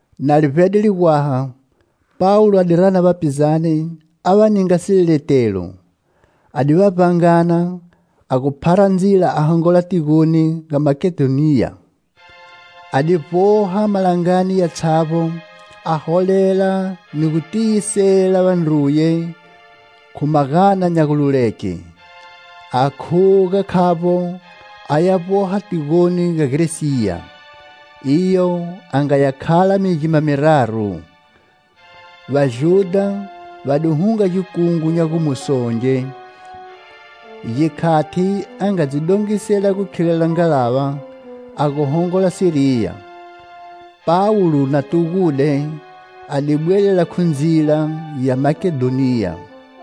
Na li vbede ligwaha, Pawulo a di rana vapizane a va ninga sileletelo. A di va vbangana, a gu phara ndzila a hongola tigoni ga Makedhoniya. A di vboha malangani yatshavbo a holela ni gu tiyisela vandruye khu magana nya gululeke. A khuga khavbo a ya vboha tigoni ga Gresiya; iyo a nga ya khala migima miraru. Vajudha va di hunga gikungu nya gumusonge, gikhati a nga dzi dongisela gu khilela ngalava a gu hongola Siriya. Pawulo na tugude, a di bwelela khu ndzila ya Makedhoniya.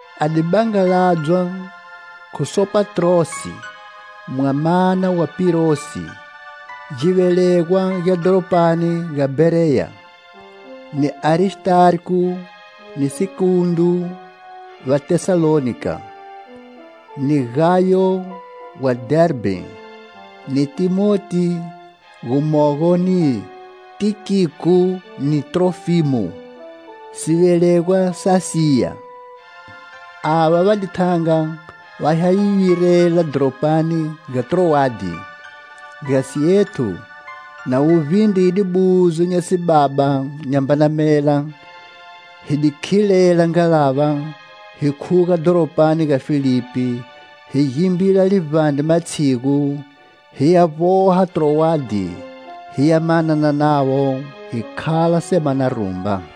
A di bangaladzwa khu Sopatrosi, mwamana wa Pirusi, givelegwa gya dhoropani ga Bhereya; ni Aristarko ni Sekundo va Tesalonika; ni Gayo wa Dherbhe, ni Thimoti gumogo ni Tikiko ni Trofimo, sivelegwa sa Asiya. Ava va di thanga va ya hi virela dhoropani ga Trowade. Gasi ethu, na wu vbindride buzo nya sibaba nyambana mela, hi di khilela ngalava hi khuga dhoropani ga Filipi, hi gimbila livbandre matshigu, hiya vboha Trowade, hiya manana navo, hi khala semana rumba.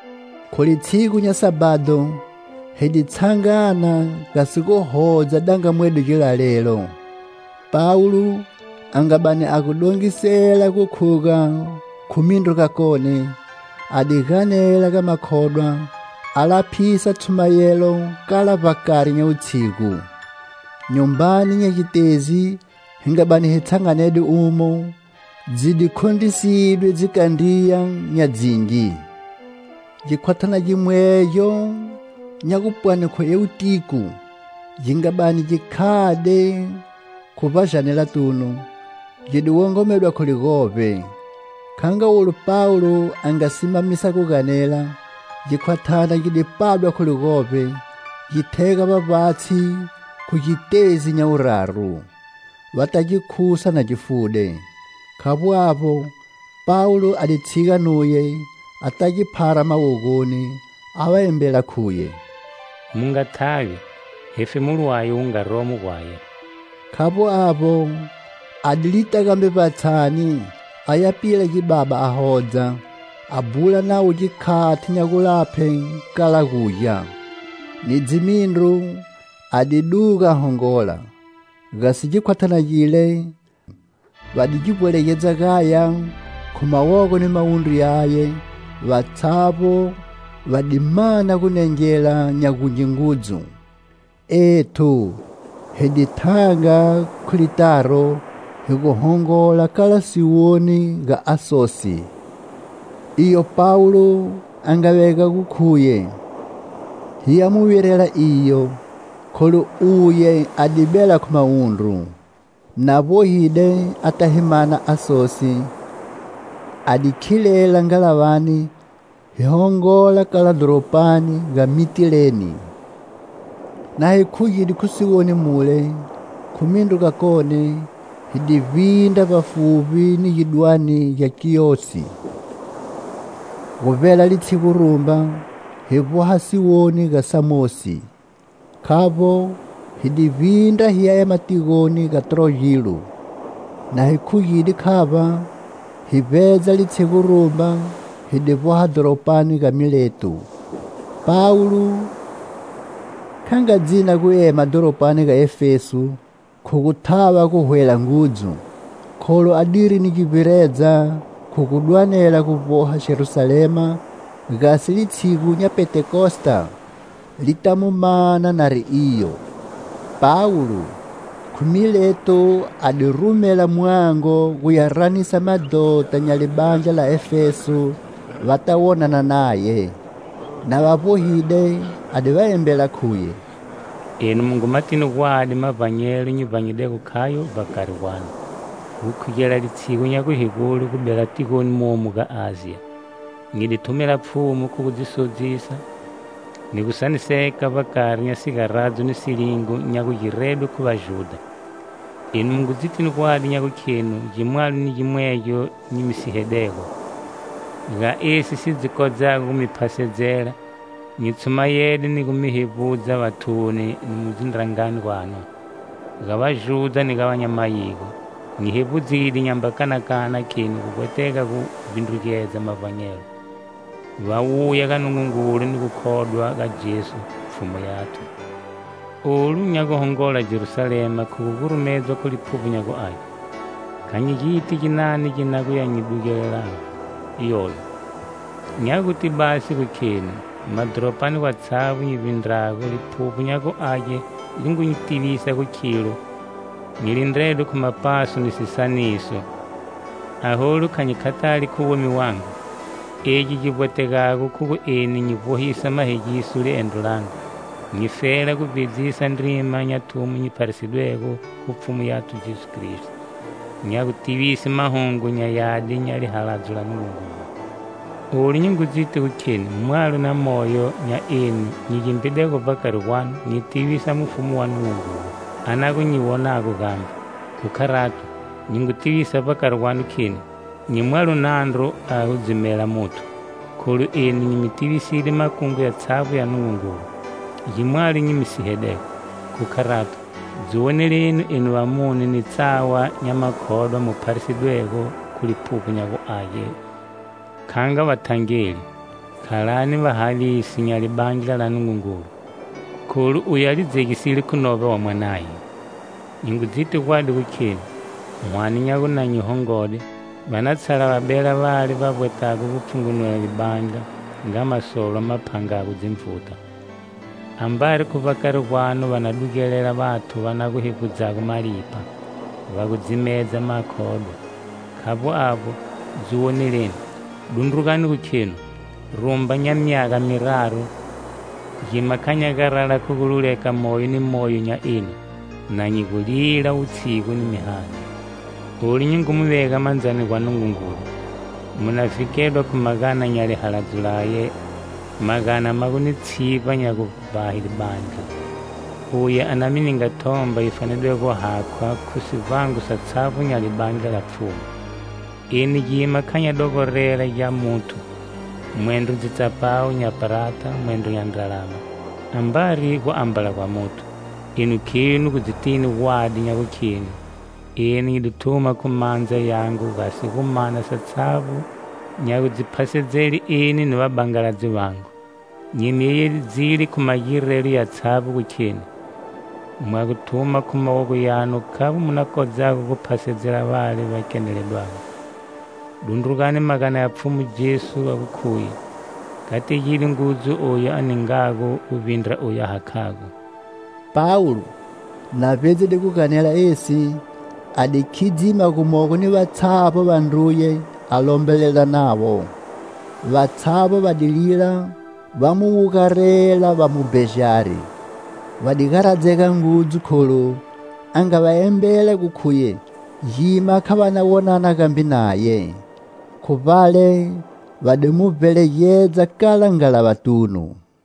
Khu litshigu nya Sabhado hi di tshangana gasi gu hodza dangamwedo gilalelo. Pawulo a nga bani a gu dongisela gu khuga khu mindru gakone, a di ganela ga makhodwa, a laphisa tshumayelo kala vbakari nya wutshigu. Nyumbani nya gitezi hi nga bani hi tshanganede umo, dzi di khondrisidwe dzikandriya nya dzingi. Gikhwathana gimwegyo nya gupwani khu Eutiko gi nga bani gi khade khu vbajanelatunu, gi di wongomedwa khu ligovbe. Kha nga olu Pawulo a nga simamisa gu ganela, gikhwathana gi di padwa khu ligovbe, gi thega vbavbatshi khu gitezi nya wuraru. Vata gi khusa na gi fude. Khavbo avbo, Pawulo a di tshiga nuye a ta gi phara mawogoni, a va embela khuye: "Mu nga thavi, hefemulo waye wu nga romo gwaye!" Khavbo avbo, a di lita gambe vbatshani aya pila gibaba a hodza, a bhula navo gikhati nya gulaphe kala gugya. Ni dzimindru a di duga a hongola. Gasi gikhwathana gile, va di gi vbwelegedza gaya khu mawogo ni mawundru yaye, vatshavbo va di mana gu nengela nya gungi ngudzu. Ethu hi di thanga khu litaro hi gu hongola kala siwoni ga Asosi; iyo Pawulo a nga vega gu khuye hi ya mu virela iyo, kholu uye a di bela khu mawundru. Na vbohide ata hi mana Asosi, a di khilela ngalavani hi hongola kala dhoropani ga Mitileni. Na hi khugide khu siwoni mule, khu mindru gakone, hi di vbindra vbafuvbi ni gidwane gya Kiyosi. Gu vbela litshigu rumba, hi vboha siwoni ga Samosi. Khavbo, hi di vbindra hi ya ema tigoni ga Trogilo, na hi khugide khavba, hi vbedza litshigu rumba hi di vboha dhoropani ga Mileto. Pawulo kha nga dzina gu ema dhoropani ga Efeso khu gu thava gu hwela ngudzu, kholu adiri ni gu vbiredza khu gu dwanela gu vboha Jerusalema, gasi litshigu nya Pentekosta li ta mu mana nari iyo. Pawulo, khu Mileto a di rumela mwango guya ranisa madhota nya libandla la Efeso, va ta wonana naye. Na va vbohide, a di va embela khuye: "Enu mu ngu matini gwadi mavbanyelo nyi vbanyidego khayo vbakari gwanu, gukhugela litshigu nya guhegule gu bela tigoni momu ga Asiya. Nyi di thumela Pfhumu khu gu dzi sodzisa, ni gu saniseka vbakari nya sigaradzo ni silingo nya gugiredwe khu Vajudha. Enu mu ngu dzitini gwadi nya gukhenu gimwalo ni gimwegyo nyi mi sihedego, ga esi si dzi kodzago gu mi phasedzela, nyi tshumayede ni gu mi hevbudza vathuni ni mu dzindrangani gwanu. Ga Vajudha ni ga va nya mayigo nyi hevbudzide nyamba kanakana kheni gu vbwetega gu vbindrugedza mavbanyelo, va wuya ga Nungungulu ni gu khodwa ga Jesu, Pfhumu yathu. Olu nya guhongola Jerusalema khu gu gurumedzwa khu Liphuvbo nya gu Age. Kha nyi giti ginani gi na gu ya nyi dugelelago iyoyo. Nya guti basi gu kheni, madhoropani gwatshavbo nyi vbindrago, Liphuvbo nya gu Age li ngu nyi tivisa gu khilo nyi lindredwe khu mapaso ni sisaniso. Aholu kha nyi khathali khu womi wangu. Egi gi vbwetegago khu gu eni nyi vbohisa mahegiso liendro langu, nyifela gu vbedzisa ndrima nya thumo nyi pharisidwego khu Pfhumu yathu Jesu Kristo, nya gutivise Mahungu nya Yadi nya lihaladzo la Nungungulu. "Olu nyi ngu dziti gu kheni mwalo na moyo nya enu nyi gimbidego vbakari gwanu nyi tivisa Mufumu wa Nungungulu, a na gu nyi wonago gambe. Khu kharato, nyi ngu tiyisa vbakari gwanu kheni: nyi mwalo nandru a gu dzimela muthu, kholu eni nyi mi tiviside makungu yatshavbo ya Nungungulu. Gimwalo nyi mi sihedego. Khu kharato, dzi woneleni enu vamune ni tsawa nya makhodwa mu pharisidwego khu Liphuvbo nya gu Age kha nga vathangeli. Khalani vahavisi nya libandla la Nungungulu, kholu uye a li dzegisile khu novba wa Mwanaye. Nyi ngu dziti gwadi gu kheni, hwane nya gu na nyi hongode, va na tshala va bela vale va vbwetago gu pfhungumula libandla, nga masolwa ma phangago dzinvuta. Ambari khu vbakari gwanu va na dugelela vathu va na gu hevbudzago malipha, va gu dzimedza makhodwa. Khavbo avbo, dziwoneleni. Dundrugani gu khenu, rumba nya myaga miraru, gima kha nya garala khu gu luleka moyo ni moyo nya enu, na nyi gu lila wutshigu ni mihani. Olu nyi ngu mi vega mandzani gwa Nungungulu, mu na vhikedwa khu magana nya lihaladzo laye, magana ma gu ni tshivba nya gu vbahe libandla, uye a na mi ninga thomba yi fanedego gu hakhwa khu sivbango satshavbo nya libandla la Pfhumu. Eni gima kha nya dogorela gya muthu, mwendro dzitsapawu nya prata mwendro nya ndralama, ambari guambala gwa muthu. Enu khenu gu dzitini gwadi nya gukhenu, eni nyi di thuma khu mandza yangu gasi gu mana satshavbo nya gu dzi phasedzele eni ni vabangaladzi vangu. Nyi mi yeyedzile khu magirelo yatshavbo gu kheni, mwa gu thuma khu mawogo yanu khavbo mu na kodzago gu phasedzela vale va keneledwago. Dundrugani magana ya Pfhumu Jesu a gu khuye: 'Kategide ngudzu oyu a ningago gu vbindra oyu a hakhago.' " Pawulo, na vbedzile gu ganela esi, a di khidzima gumogo ni vatshavbo vandruye a lombelela navo. Vatshavbo va di lila va mu wugarela va mu bejari. Va di garadzega ngudzu kholu a nga va embela gu khuye gima kha va na wonana gambe naye. Khu vbale va di mu vbelegedza kala ngalavatunu.